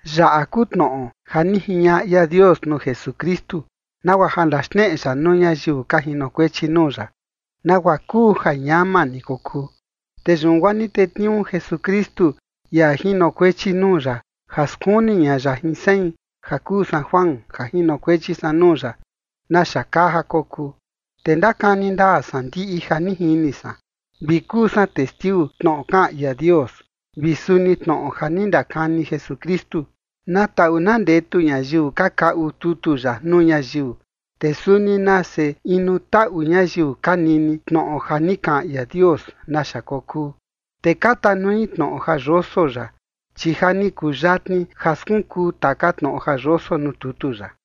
Yaꞌa kuu tnoꞌo ja ni jiñaꞌa ia Dios nuu Jesukristu, nagua ja ndaxneꞌe ya nuu ñayiu ka jinokuechi nuu ya, nagua kuu ja ñama ni kokuu. Te yun guaa ni tetniuu Jesukristu ia jinokuechi nuu ya ja skuni ña ya jin sein ja kuu san Juan ja jinokuechi san nuu ya naxa kaa ja kokuu. Te ndakani ndaa san ndiꞌi ja ni jini san, vi kuu san testiu tnoꞌo kaꞌan ia Dios, vi suni tnoꞌo ja ni ndakani Jesukristu. Na taꞌu na ndetu ñayiu ka kaꞌu tutu yaꞌa nuu ñayiu, te suni nase inu taꞌu ñayiu ka nini tnoꞌo ja ni kaꞌan ia Dios naxa kokuu, te ka tanui tnoꞌo ja yoso yaꞌa, chi ja ni kuyatni ja skunkuu taka tnoꞌo ja yoso nuu tutu yaꞌa.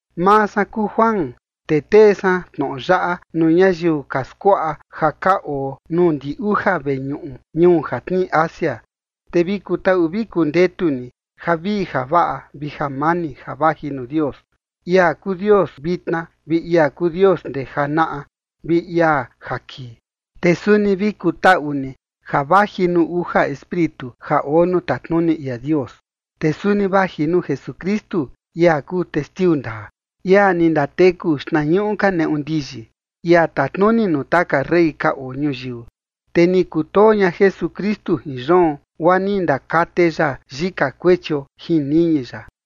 Maa san kuu Juan, te tee san tnoꞌo yaꞌa nuu ñayiu ka skuaꞌa ja ka oo nuu ndi uja veñuꞌu ñuu ja tnii Asia. Te vi kutaꞌu vi kundetu ni javii javaꞌa vi jamani ja vaji nuu Dios, ia kuu Dios vitna, vi ia kuu Dios ndee janaꞌa, vi ia ja kii. Te suni vi kutaꞌu ni ja vaji nuu uja Espíritu ja oo nuu tatnuni ia Dios. Te suni vaji nuu Jesukristu, ia kuu testiu ndaa, ia ni ndateku xtnañuꞌu ka neꞌu ndiyi, ia tatnuni nuu taka rey ka oo ñuyiu. Te ni kutoo ña Jesukristu jin yoon guaa ni ndakate ya yika kuechio jin niñi ya.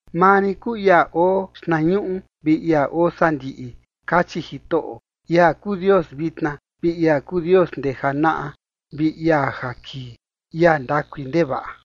“Maa rin kuu ia oo xtnañuꞌu vi ia oo sandiꞌi”, kachi Jitoꞌo, ia kuu Dios vitna, vi ia kuu Dios ndee janaꞌa, vi ia ja kii, ia ndakui ndevaꞌa.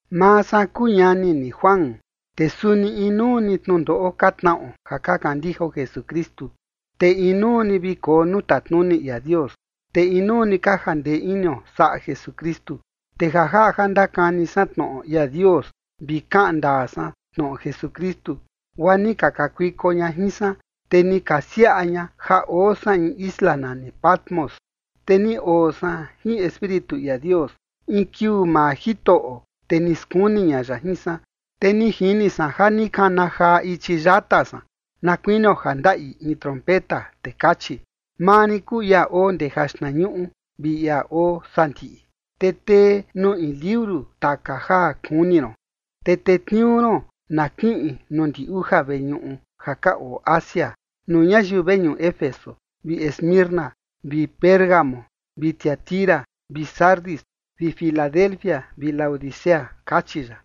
Maa san kuu ñani ni Juan, te suni inuu ni tnundoꞌo ka tnaꞌo ja ka kandijao Jesukristu. Te inuu ni vi koo nuu tatnuni ia Dios, te inuu ni ka jandee inio saꞌa Jesukristu. Te ja jaꞌa ja ndakani san tnoꞌo ia Dios vi kaꞌan ndaa san tnoꞌo Jesukristu, guaa ni ka kakuiko ña jin san, te ni ka siaꞌa ña ja oo san in isla nani Patmos. Te ni oo san jin Espíritu ia Dios in kiuu maa Jitoꞌo, te ni skuni ña ya jin san. Te ni jini san ja ni kana jaa ichi yata san na kuinio ja ndaꞌi in trompeta. Te kachi: ―Maa rin kuu ia oo ndee jaxtnañuꞌu vi ia oo sandiꞌi. Te tee nuu in liuru taka ja kuni ron, te tetniuu ron na kiꞌin nuu ndi uja veñuꞌu ja ka oo Asia, nuu ñayiu veñuꞌu Éfeso vi Esmirna vi Pérgamo vi Tiatira vi Sardis vi Filadelfia vi Laodicea ―kachi ya.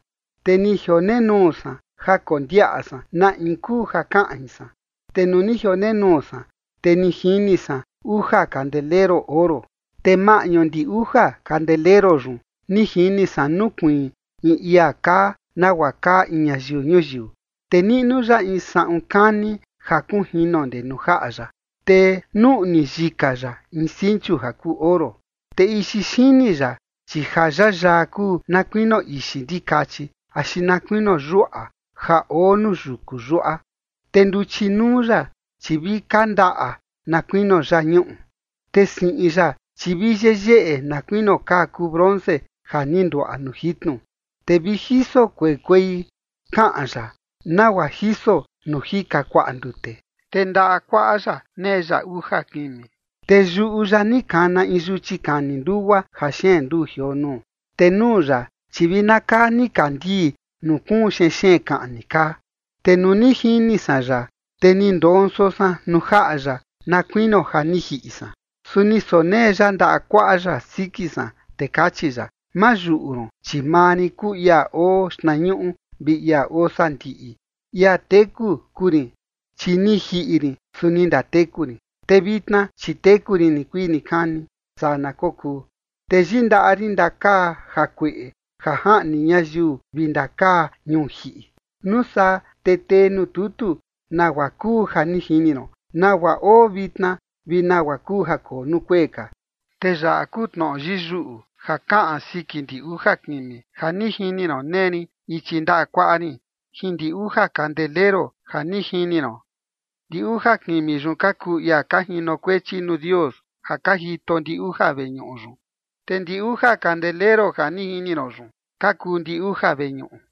Te ni jionenuu san ja kondiaꞌa san na in kuu ja kaꞌan jin san, te nuu ni jionenuu san, te ni jini san uja kandeleru oro. Te maꞌñu ndi uja kandeleru yun ni jini san nukuiin in ia kaa nagua kaa in ñayiu ñuyiu. Te niꞌnu ya in saꞌun kani ja kunjino ndee nuu jaꞌa ya, te nuꞌni yika ya in sinchu ja kuu oro. Te ixi xini ya, chi ja yayaa kuu na kuinio ixi ndikachi axi na kuinio yuaꞌa ja oo nuu yuku yuaꞌa. Te nduchi nuu ya, chi vi kandaꞌa na kuinio yañuꞌu. Te siꞌin ya, chi vi yeyeꞌe na kuinio kaa kuu bronce ja ni nduaꞌa nuu jitnu, te vi jiso kuei kuei kaꞌan ya, nagua jiso nuu jika kuaꞌa ndute. Te ndaꞌa kuaꞌa ya nee ya uja kimi, te yuꞌu ya ni kana in yuchi kani ndugua ja xeen nduu jioo nuu. Te nuu ya, chi vi na kaa nikandii nuu kuun xenxeen kaꞌni kaa. Te nuu ni jini san ya, te ni ndonso san nuu jaꞌa ya na kuinio ja ni jiꞌi san. Su ni sonee ya ndaꞌa kuaꞌa ya siki san, te kachi ya: ―Ma yuꞌu ron, chi maa rin kuu ia oo xtnañuꞌu vi ia oo sandiꞌi. Ia teku kuu rin, chi ni jiꞌi rin, su ni ndateku rin, te vitna chi teku rin nikuii nikani. Saa na kokuu. Te yindaꞌa rin ndakaa jakueꞌe ja jaꞌni ñayiu vi ndakaa ñuu jiꞌi. Nuu saa te tee nuu tutu nagua kuu ja ni jini ron, nagua oo vitna, vi nagua kuu ja koo nuu kuee ka. Te yaꞌa kuu tnoꞌo yiyuꞌu ja kaꞌan siki ndi uja kimi ja ni jini ron nee rin ichi ndaꞌa kuaꞌa rin jin ndi uja kandeleru ja ni jini ron: ndi uja kimi yun ka kuu ia ka jinokuechi nuu Dios ja ka jito ndi uja veñuꞌu yun, te ndi uja kandeleru ja ni jini ron yun ka kuu ndi uja veñuꞌu.